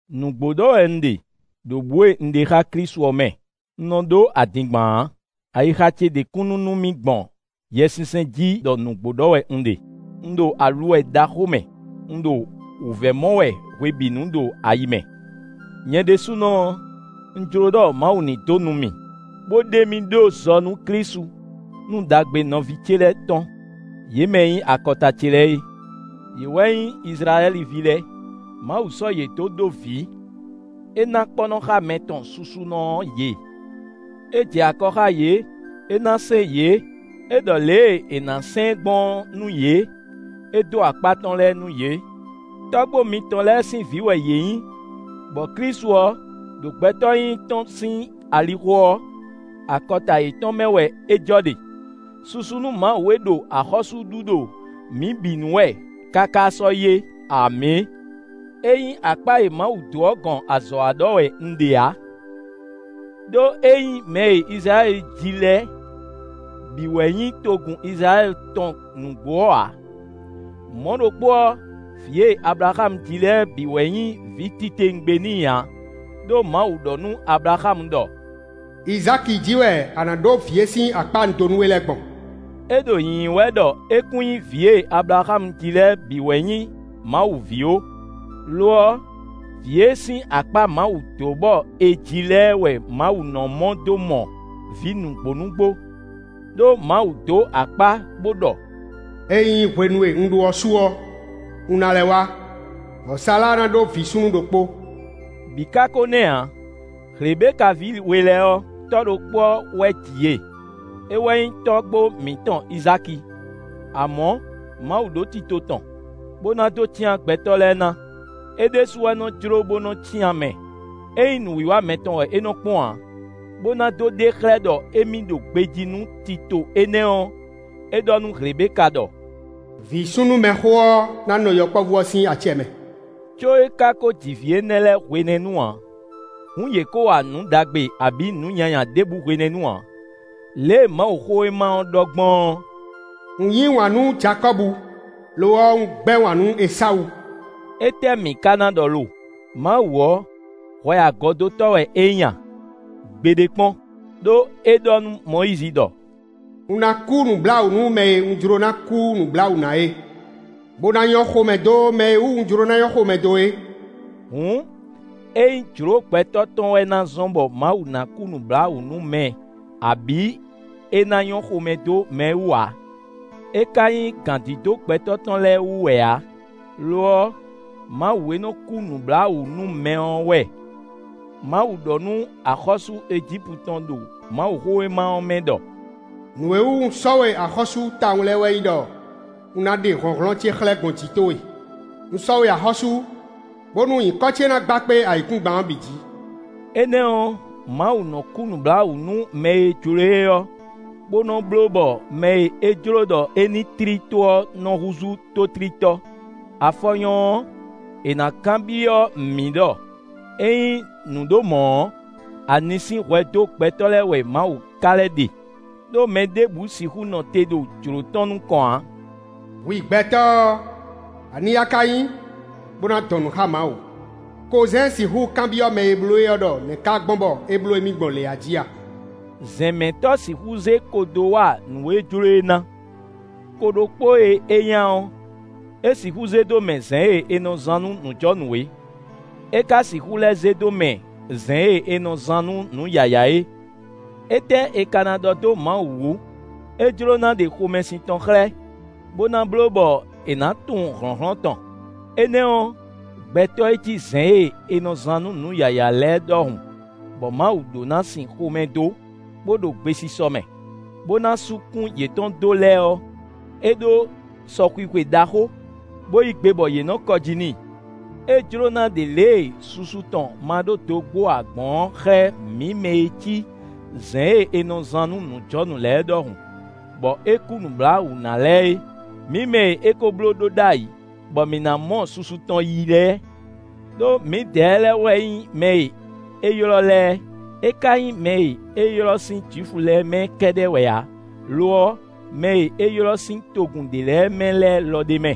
Nǔgbó ɖɔ wɛ un ɖe, ɖo bǔ e un ɖe xá Klísu ɔ́ mɛ; un nɔ ɖó adingban ǎ. Ayixa ce ɖe kúnnu nú mì gbɔn Yɛsinsɛn jí ɖɔ nǔgbó ɖɔ wɛ un ɖe. Un ɖo aluwɛ ɖaxó mɛ; un ɖo wǔvɛ́ mɔ wɛ hwebǐnu ɖo ayi mɛ. Nyɛ ɖésúnɔ ɔ́, un jló ɖɔ Mawu ní dó nu mì, bó ɖe mì ɖó zɔ nú Klísu, nú ɖagbe nɔví ce lɛ́ɛ tɔn; yě mɛ e nyí akɔta ce lɛ́ɛ é. Yě wɛ nyí Izlayɛ́li ví lɛ́ɛ. Mawu sɔ́ yě dó ɖó vǐ; é ná kpɔ́nɔxámɛ tɔn susunɔ ɔ́ yě; é jɛ akɔ xá yě; é ná sɛ́n yě, é ɖɔ lě e è nǎ sɛn ɛ gbɔn ɔ́ nú yě; é dó akpá tɔn lɛ́ɛ nú yě. Tɔ́gbó mitɔn lɛ́ɛ sín vǐ wɛ yě nyí, bɔ Klísu ɔ́, ɖo gbɛtɔ́ nyínyí tɔn sín alixo ɔ́, akɔta yětɔn mɛ wɛ é jɔ ɖe. Susu nú Mawu e ɖo axɔ́sú ɖu ɖo mǐ bǐ nu wɛ káká sɔ́yi é. Amǐ! Ényí akpá e Mawu dó ɔ́ gɔn azɔ̌ wa ɖɔ wɛ un ɖe ǎ. Đó é nyí mɛ e Izlayɛ́li ji lɛ́ɛ bǐ wɛ nyí togun Izlayɛ́li tɔn nǔgbó ɔ́ ǎ. Mɔ̌ ɖokpó ɔ́, vǐ e Ablaxámu ji lɛ́ɛ bǐ wɛ nyí vǐ titewungbe n'i ǎ; ɖó Mawu ɖɔ nú Ablaxámu ɖɔ: “Izáki jí wɛ a nǎ ɖó vǐ e sín akpá un dó nú we lɛ́ɛ gbɔn.” É ɖo nyǐnyí wɛ ɖɔ é kún nyí vǐ e Ablaxámu ji lɛ́ɛ bǐ wɛ nyí Mawu ví ó; lo ɔ́, vǐ e sín akpá Mawu dó bɔ è ji lɛ́ɛ wɛ Mawu nɔ mɔ dó mɔ vǐ nǔgbó nǔgbó. Đó Mawu dó akpá, bó ɖɔ: “Ényí hwenu e un ɖó ɔ́ su ɔ́, un ná lɛ́ wá, bɔ Sala ná ɖó vǐ súnnu ɖokpó.” Bǐ ká kó nɛ́ ǎ. Hlebeka ví we lɛ́ɛ ɔ́, tɔ́ ɖokpó ɔ́ wɛ ji yě; é wɛ nyí tɔ́gbó mǐtɔn Izáki. Amɔ̌, Mawu ɖó tito tɔn, bó ná dó cyán gbɛtɔ́ lɛ́ɛ ná: é ɖésú wɛ nɔ́ jló bó nɔ́ cyán mɛ; é nyí nǔwiwa mɛtɔn wɛ é nɔ́ kpɔ́n ǎ. Bó ná dó ɖe xlɛ́ ɖɔ émí ɖo gbejí nú tito énɛ́ ɔ́, é ɖɔ nú Hlebeka ɖɔ: “Vǐ súnnu mɛxó ɔ́ ná nɔ yɔkpɔ́vú ɔ́ sín acɛ mɛ;” có é ká kó ji vǐ énɛ́ lɛ́ɛ hwenɛ́nu ǎ; hǔn yě kó wa nǔ ɖagbe abǐ nǔ nyanya ɖěbǔ hwenɛ́nu ǎ. Lě e Mawuxówéma ɔ́ ɖɔ gbɔn ɔ́: “Un yí wǎn nú Jakɔ́bu; lo ɔ́, un gbɛ́ wǎn nú Esawu.” Étɛ́ mǐ ka ná ɖɔ lo? Mawu ɔ́, hwɛ agɔdótɔ́ wɛ é nyí a? Gbeɖé kpɔ́n. Đó é ɖɔ nú Mɔyízi ɖɔ: “Un ná kú nǔbláwǔ nú mɛ e un jló ná kú nǔbláwǔ na é, bó ná nyɔ́ xomɛ dó mɛ e wú un jló na nyɔ́ xomɛ dó é.” Hǔn, é nyí jló gbɛtɔ́ tɔn wɛ na zɔ́n bɔ Mawu ná kú nǔbláwǔ nú mɛ abǐ é ná nyɔ́ xomɛ dó mɛ wú ǎ; é ka nyí gǎndídó gbɛtɔ́ tɔn lɛ́ɛ wú wɛ ǎ. Lo ɔ́, Mawu e nɔ kú nǔbláwǔ nú mɛ ɔ́ wɛ. Mawu ɖɔ nú axɔ́sú Ejípu tɔn ɖo Mawuxówéma ɔ́ mɛ ɖɔ: “Nǔ e wú un sɔ́ we axɔ́sú tawun lɛ́ɛ wɛ nyí ɖɔ un ná ɖe hlɔ̌nhlɔ́n ce xlɛ́ gbɔn jǐ towe; un sɔ́ we axɔ́sú, bónú nyǐkɔ ce ná gba kpé ayǐkúngban ɔ́ bǐ jǐ.” Énɛ́ ɔ́, Mawu nɔ kú nǔbláwǔ nú mɛ e jló e ɔ́, bó nɔ bló bɔ mɛ e é jló ɖɔ é ní tlí tó ɔ́ nɔ húzú tótlítɔ́. Afɔ nyɔ́ ɔ́, è nǎ kanbyɔ́ mǐ ɖɔ: “Ényí nǔ ɖo mɔ̌ ɔ́, ani sín hwɛ dó gbɛtɔ́ lɛ́ɛ wɛ Mawu ka lɛ́ ɖe? Đó mɛ ɖěbǔ sixú nɔ te ɖo jlǒ tɔn nukɔn ǎ.” Hwi gbɛtɔ́ ɔ́, ani a ka nyí, bó ná dɔn nǔ xá Mawu? Kozɛ́n sixú kanbyɔ́ mɛ e bló é ɔ́ ɖɔ nɛ̌ ká gbɔn bɔ é bló émí gbɔn lě ají a? Zɛ̌nmɛtɔ́ sixú zé ko dó wa nǔ e jló é ná: ko ɖokpó e é nya ɔ́, é sixú zé dó mɛ zɛ̌n e è nɔ zán nú nǔjɔnǔ é; é ka sixú lɛ́ zé dó mɛ zɛ̌n e è nɔ zán nú nǔ yǎyá é. Étɛ́ è ka ná ɖɔ dó Mawu wǔ? É jló ná ɖe xomɛsin tɔn xlɛ́, bó ná bló bɔ è nǎ tunwun hlɔ̌nhlɔ́n tɔn. Énɛ́ ɔ́, gbɛtɔ́ e cí zɛ̌n e è nɔ zán nú nǔ yǎyá lɛ́ɛ ɖɔhun bɔ Mawu ɖó ná sin xomɛ dó, bó ɖo gbesisɔ mɛ, bó ná sú kún yětɔn dó lɛ́ɛ ɔ́, é ɖó sɔxwixwe ɖaxó, bó yí gbe bɔ yě nɔ kɔ jí n'i. É jló ná ɖe lě e susu tɔn ma ɖó dogbó ǎ gbɔn ɔ́ xlɛ́ mǐ mɛ e cí zɛ̌n e è nɔ zán nú nǔjɔnǔ lɛ́ɛ ɖɔhun bɔ é kú nǔbláwǔ ná lɛ́ɛ é; mǐ mɛ e é kó blóɖó ɖ'ayǐ, bɔ mǐ ná mɔ susu tɔn yí lɛ́ɛ. Đó mǐdɛɛ lɛ́ɛ wɛ nyí mɛ e é ylɔ́ lɛ́ɛ; é ka nyí mɛ e é ylɔ́ sín Jwifu lɛ́ɛ mɛ lɛ́ɛ kɛ́ɖɛ́ wɛ ǎ, lo ɔ́, mɛ e é ylɔ́ sín togun ɖě lɛ́ɛ mɛ lɛ́ɛ lɔ ɖ'é mɛ.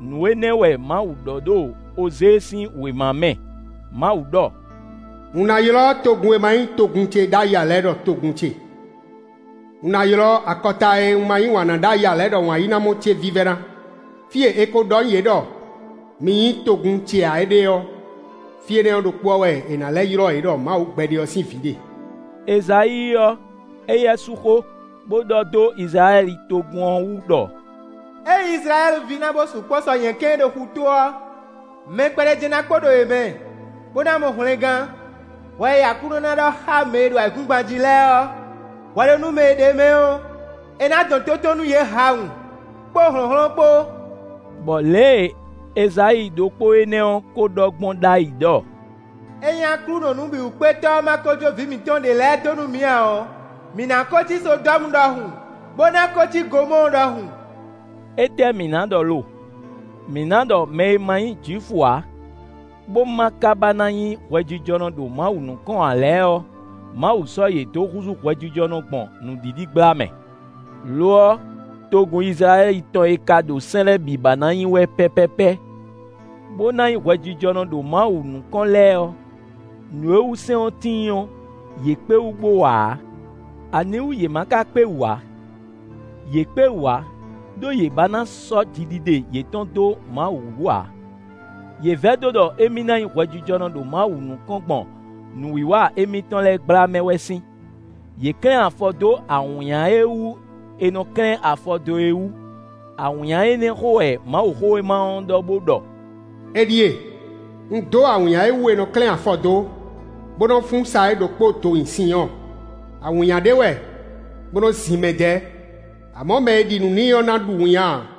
Nǔ énɛ́ wɛ Mawu ɖɔ ɖo Ozée sín wěma mɛ; Mawu ɖɔ: “Un ná ylɔ́ togun e ma nyí togun ce ɖ'ayǐ ǎ lɛ́ɛ ɖɔ togun ce; un ná ylɔ́ akɔta e un ma yí wǎn ná ɖ'ayǐ ǎ ɖɔ wǎnyínámɔ ce vívɛ́ná. Fí e è ko ɖɔ nú yě ɖɔ: ‘Mi nyí togun ce ǎ’ ɖe ɔ́, fí énɛ́ ɖokpó ɔ́ wɛ è nǎ lɛ́ ylɔ́ yě ɖɔ Mawu gbɛɖe ɔ́ sín vǐ ɖe.” Ezayíi ɔ́, éyɛ́ sú xó, bó ɖɔ dó Izlayɛ́li togun ɔ́ wú ɖɔ: “Ényí Izlayɛ́li ví na bo sukpɔ́ sɔ nyɛ̌kɛ́n e ɖo xutó ɔ́, mɛ kpɛɖé jɛ́n ná kpo ɖo yě mɛ bó ná mɔ hwlɛngán. Hwɛ e Aklúnɔ ná ɖɔ xá mɛ e ɖo ayǐkúngban jí lɛ́ɛ ɔ́, hwɛɖónúmɛ e ɖ'é mɛ ɔ́, é ná dɔn tó tɔn nú yě hawun, kpó hlɔ̌nhlɔ́n kpó.” Bɔ lě e Ezayíi ɖokpó énɛ́ ɔ́ kó ɖɔ gbɔn ɖ'ayǐ ɖɔ: “Ényí Aklúnɔ Nǔbǐwúkpétɔ́ ɔ́ ma ko jó vǐ mǐtɔn ɖě lɛ́ɛ dó nú mǐ ǎ ɔ́, mǐ ná kó cí Sodɔ́mu ɖɔhun, bó ná kó cí Gomɔ́ɔ ɖɔhun.” Étɛ́ mǐ ná ɖɔ lo? Mǐ ná ɖɔ mɛ e ma nyí Jwifu ǎ, bó ma ka ba na nyí hwɛjijɔnɔ ɖo Mawu nukɔn ǎ lɛ́ɛ ɔ́, Mawu sɔ́ yě dó húzú hwɛjijɔnɔ gbɔn nǔɖiɖi gbla mɛ. Lo ɔ́, togun Izlayɛ́li tɔn e ka ɖo sɛ́n lɛ́ɛ bǐ ba ná nyi wɛ pɛ́pɛ́pɛ́, bó ná nyí hwɛjijɔnɔ ɖo Mawu nukɔn lɛ́ɛ ɔ́, nǔ e wú sɛ́n ɔ́ tíin ɔ́, yě kpé wú bó wa ǎ. Aniwú yě ma ka kpé wú ǎ? Yě kpé wú ǎ, ɖó yě ba ná sɔ́ jiɖiɖe yětɔn dó Mawu wú ǎ; yě vɛdó ɖɔ émí ná nyí hwɛjijɔnɔ ɖo Mawu nukɔn gbɔn nǔwiwa émítɔn lɛ́ɛ gbla mɛ wɛ sín. Yě klɛ́n afɔ dó awǐnnya e wú è nɔ klɛ́n afɔ dó é wú. Awǐnnya énɛ́ xó wɛ Mawuxówéma ɔ́ ɖɔ bó ɖɔ: “Éɖíe! Un dó awǐnnya e wú è nɔ klɛ́n afɔ dó, bó nɔ fún sa é ɖokpó do nyi Sinyɔ́ɔ; awǐnnya ɖé wɛ bó nɔ́ zin mɛ dɛ́; amɔ̌ mɛ e ɖi nǔ n'i ɔ́ ná ɖu winnyá ǎ.”